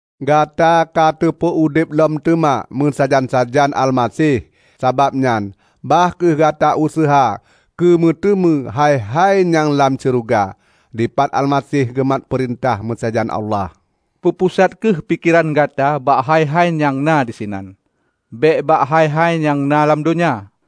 Gata ka teupeu udeb lom teuma meusajan-sajan Almaseh. Sabab nyan bah kheueh gata useuha keumeuteumé hai-hai nyang lam syeuruga, dipat Almaseh geumat peurintah meusajan Allah. Peupusat kheueh pikeran gata bak hai-hai nyang na disinan, bék bak hai-hai nyang na lam donya.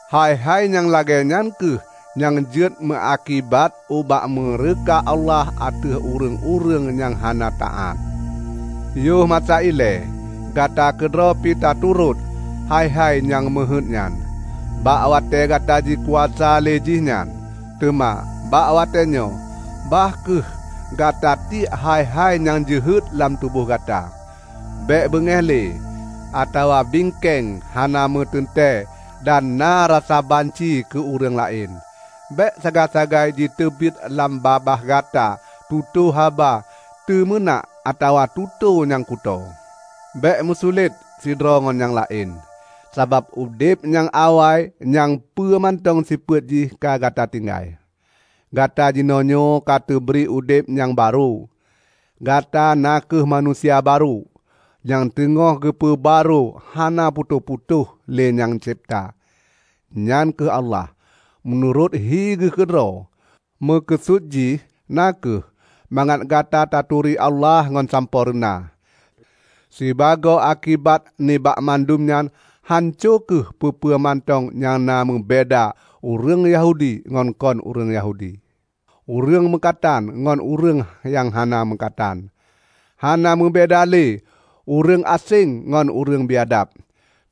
Hai-hai nyang lagée nyan kheueh nyang jeuet meuakibat ubak meureuka Allah ateueh ureuëng-ureuëng nyang hana taát. Yoh masa ilée gata keudroe pi taturot hai-hai nyang meuheuét nyan, bak watée gata jikuasa lé jih nyan. Teuma bak watée nyoe bah kheueh gata tiek hai-hai nyang jeuhet lam tuboh gata: bék beungéh lé, atawa bingkéng hana meuteuntée dan na rasa banci keu ureuëng laén. Bék sagai-sagai jiteubiet lam babah gata tutoe haba teumeunak atawa tutoe nyang kutoe. Bék meusulet sidroe ngon nyang laén, sabab udeb nyang awai nyang peue mantong sifeuet jih ka gata tinggai. Gata jinoenyoe ka teubri udeb nyang barô. Gata na kheueh manusia barô, nyang teungoh geupeu barô hana putôh-putôh lé nyang cebta, nyan kheueh Allah, meunurot hi geuh keudroe. Meukeusut jih na kheueh mangat gata taturi Allah ngon sampoereuna. Sibagoe akibat nibak mandum nyan hanco kheueh peue-peue mantong nyang na meubeda ureuëng Yahudi ngon kon ureuëng Yahudi, ureuëng meukatan ngon ureuëng nyang hana meukatan, hana meubeda lé ureuëng aséng ngon ureuëng biadab,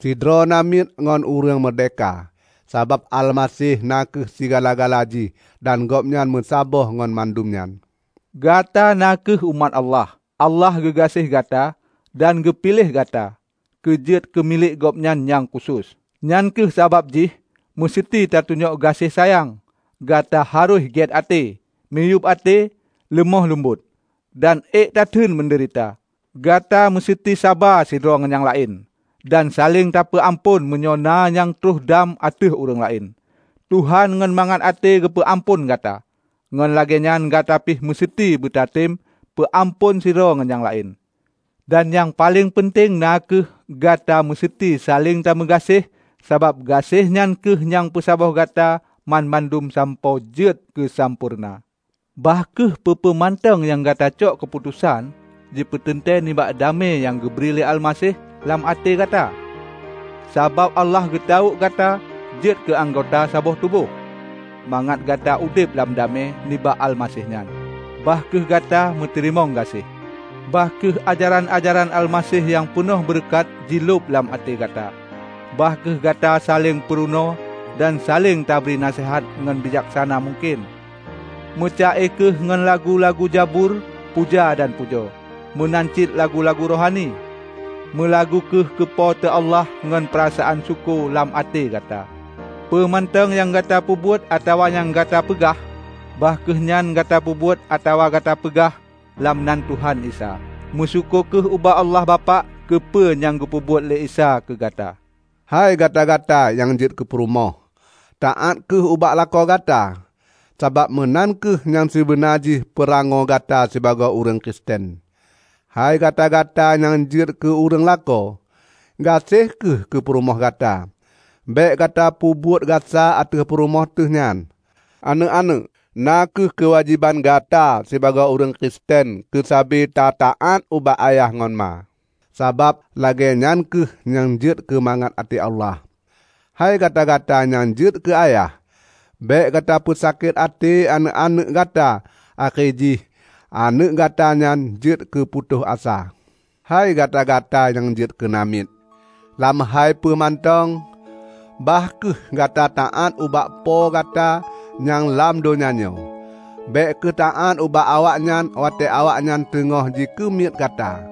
sidroe namiet ngon ureuëng meurdehka, sabab Almaseh na kheueh sigala-gala jih dan Gobnyan meusaboh ngon mandum nyan! Gata na kheueh umat Allah, Allah geugaséh gata dan geupiléh gata keujeuet keumilék Gobnyan nyang khusos. Nyang kheueh sabab jih meuseuti tatunyok gaséh sayang, gata harôh gét até, miyueb até, leumoh leumbot, dan ék gatateun meudeurita. Gata meuseuti saba sidroe ngon nyang laén, dan saléng tapeu amphon meunyoe na nyang troh dam ateueh ureuëng laén. Tuhan ngon mangat até geupeu amphon gata, ngon lagée nyan gata pih meuseuti beutateum peu amphon sidroe ngon nyang laén. Dan nyang paleng peunteng na kheueh: Gata meuseuti saléng tameugaséh sabab gaséh nyan kheueh nyang peusaboh Gata banmandum sampoe jeuet keusampoereuna. Bah kheueh peue-peue mantong nyang gata cok keuputosan jipeuteuntée nibak damé nyang geubri lé Almaseh lam até gata. Sabab Allah geutawök gata jeuet keu anggota saboh tuboh, mangat gata udeb lam damé nibak Almaseh nyan. Bah kheueh gata meuteurimong gaséh. Bah kheueh ajaran-ajaran Almaseh nyang peunoh beureukat jilhob lam até gata. Bah kheueh gata saléng peurunoe dan saléng tabri naseuhat ngon bijaksana mungken. Meuca-e kheueh ngon lagu-lagu zabur puja dan pujoe meunan cit lagu-lagu rohani; meulagu kheueh keu Po teu Allah ngon peurasaan syukoe lam até gata. Peue mantong nyang gata peubuet atawa nyang gata peugah, bah kheueh nyan gata peubuet atawa gata peugah lam nan Tuhan Isa. Meusyukoe kheueh ubak Allah Bapak keupeue nyang geupeubuet lé Isa keugata. Hei gata-gata nyang jeuet keupurumoh! Taát kheueh ubak lakoe gata, sabab meunan kheueh nyang sibeunajih peurangoe gata sibagoe ureuëng Kristen. Hei gata-gata nyang jeuet keu ureuëng lakoe! Gaséh kheueh keupurumoh gata. Bék gata peubuet gasa ateueh purumoh teuh nyan. Aneuëk-aneuëk! Na kheueh keuwajéban gata sibagoe ureuëng Kristen keusabe ta-taát ubak ayah ngon ma, sabab lagée nyan kheueh nyang jeuet keu mangat até Allah. Hei gata-gata nyang jeuet keu ayah! Bék gata peusakét até aneuëk-aneuëk gata akhé jih aneuëk gata nyan jeuet keuputôh asa. Hei gata-gata nyang jeuet keu namiet! Lam hai peue mantong, bah kheueh gata taát ubak po gata nyang lam donya nyoe. Bék kheueh taát ubak awaknyan watée awaknyan teungoh jikeumiet gata,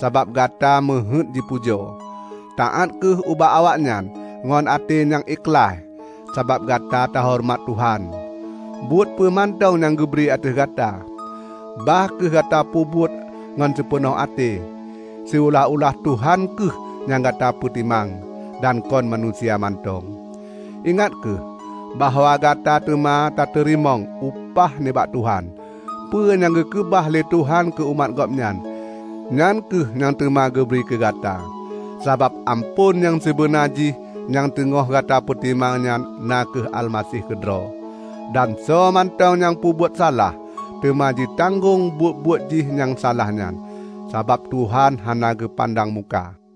sabab gata meuheuét jipujoe. Taát kheueh ubak awaknyan ngon até nyang ikhlaih, sabab gata tahoreumat Tuhan. Buet peue mantong nyang geubri ateueh gata, bah kheueh gata peubuet ngon sipeunoh até, siulah-ulah Tuhan kheueh nyang gata peutimang, dan kon manusia mantong. Ingat kheueh bahwa gata teuma tateurimong upah nibak Tuhan. Peue nyang geukeubah lé Tuhan keu umat Gobnyan, nyan kheueh nyang teuma geubri keugata. Sabab amphon nyang sibeuna jih nyang teungoh gata peutimang nyan na kheueh Almaseh keudroe. Dan soe mantong nyang peubuet salah, teuma jitanggong buet-buet jih nyang salah nyan; sabab Tuhan hana geupandang muka.